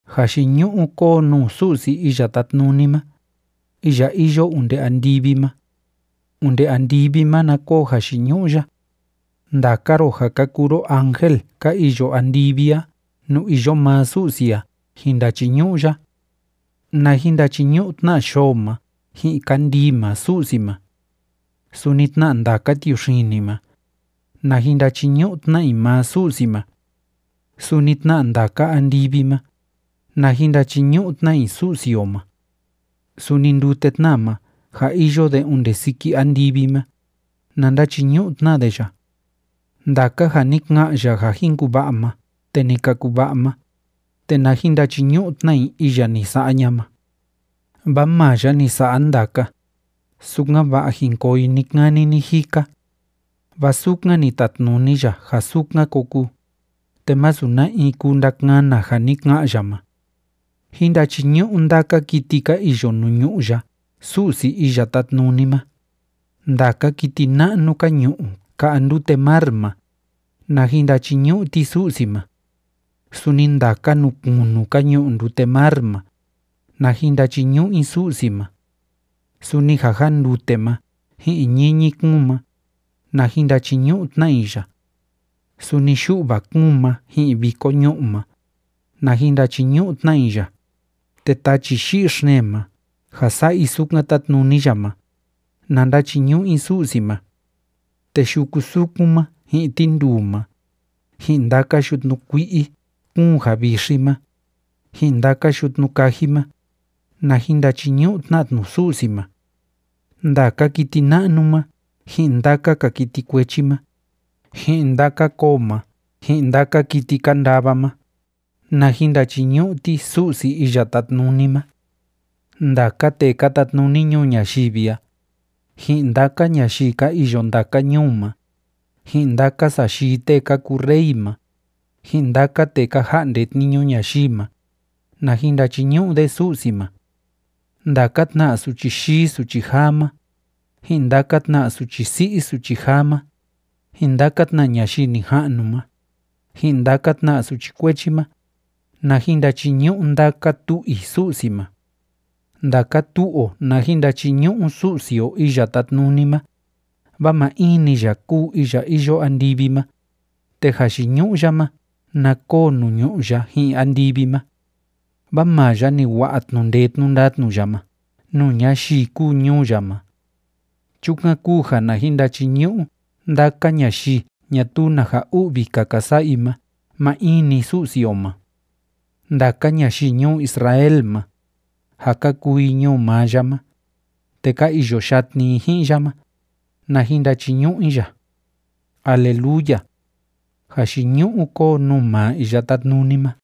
Jayiñu'u kóo nuu Su'si Iya Tátnuni ma, iya iyo onde andivi ma. Onde andivi ma na koo jayiñu'u ya. Ndaka ro ja ka kuu ro ángel ka iyo andivi a nuu iyo maa Su'si a jin ndachiñu'u ya. Na jin ndachiñu'u tna yoo ma ji'in kandii ma Su'si ma. Suni tna ndaka tiuxini ma, na jin ndachiñu'u tna i maa Su'si ma. Suni tna ndaka andivi ma, na jin ndachiñu'u tna i Su'si o ma. Suni ndute tna ma ja iyo de onde siki andivi ma, na ndachiñu'u tna de ya. Ndaka ja ni ka'an ya ja jin kuva'a ma te ni ka kuva'a ma, te na jin ndachiñu'u tna i iya ni sa'a ña'a ma. Vaa maa ya ni sa'a ndaka, sukan‑va'a jin koo i ni‑kani ni‑jika. Vaa sukan ni tatnuni ya ja sukan ko kuu, te masu na in kuu ndakana ja ni ka'an ya ma. Jín ndachiñu'u ndaka kiti ka iyo nuu ñu'ú ya Su'si Iya Tátnuni ma. Ndaka kiti na'nu ka ñu'u ka'a ndute mar ma, na jin ndachiñu'u ti Su'si ma. Suni ndaka nuu kunu ka ñu'u ndute mar ma, na jin ndachiñu'u i Su'si ma. Suni ja jándute ma ji'in ñiñi kúun ma, na jin ndachiñu'u tna i ya. Suni yu'va kúun ma ji'in viko ñu'ú ma, na jin ndachiñu'u tna i ya, te tachi yi'i xeen ma ja sa'a i sukan tátnuni ya ma, na ndachiñu'u i Su'si ma. Te yuku sukun ma ji'in tinduu ma, ji'in ndaka yutnu kui'i kúun ja vixi ma, ji'in ndaka yutnu kaji ma, na jin ndachiñu'u tna tnu Su'si ma. Ndaka kiti na'nu ma ji'in ndaka‑ka kiti kuechi ma, ji'in ndaka koo ma ji'in ndaka kiti ka ndava ma, na jin ndachiñu'u ti Su'si Iya Tátnuni ma. Ndaka tee ka tatnuni ñuu ñayivi a, ji'in ndaka ñayii ka iyo ndaka ñuu ma, ji'in ndaka sayii tee ka kuu rey ma, ji'in ndaka tee ka ja'nde tniñu ñayii ma, na jin ndachiñu'u de Su'si ma. Ndaka tna suchi yii suchi jaa ma, ji'in ndaka tna suchi si'i suchi jaa ma, ji'in ndaka tna ñayii nija'nu ma, ji'in ndaka tna suchi kuechi ma, na jin ndachiñu'u ndaka tu'u i Su'si ma. Ndaka tu'u o na jin ndachiñu'u Su'si o Iya Tátnuni ma, vaa maa in‑ni ya kúu iya iyo andivi ma, te jayiñu'u ya ma na koo nuu ñu'ú ya ji'in andivi ma. Vaa maa ya ni wa'a tnu'u ndee tnu'u ndatnu ya ma nuu ñayii kúu ñuu ya ma. Chukan kúu ja na jin ndachiñu'u ndaka ñayii ñatuu na ja u'vi‑ka ka sa'a i ma maa in‑ni Su'si o ma. Ndaka ñayii ñuu Israel ma, ja ka kuu i ñuu maa ya ma, te ka iyo yatni i ji'in ya ma, na jin ndachiñu'u i ya. ¡Aleluya! ¡Jayiñu'u kóo nuu maa Iya Tátnuni ma!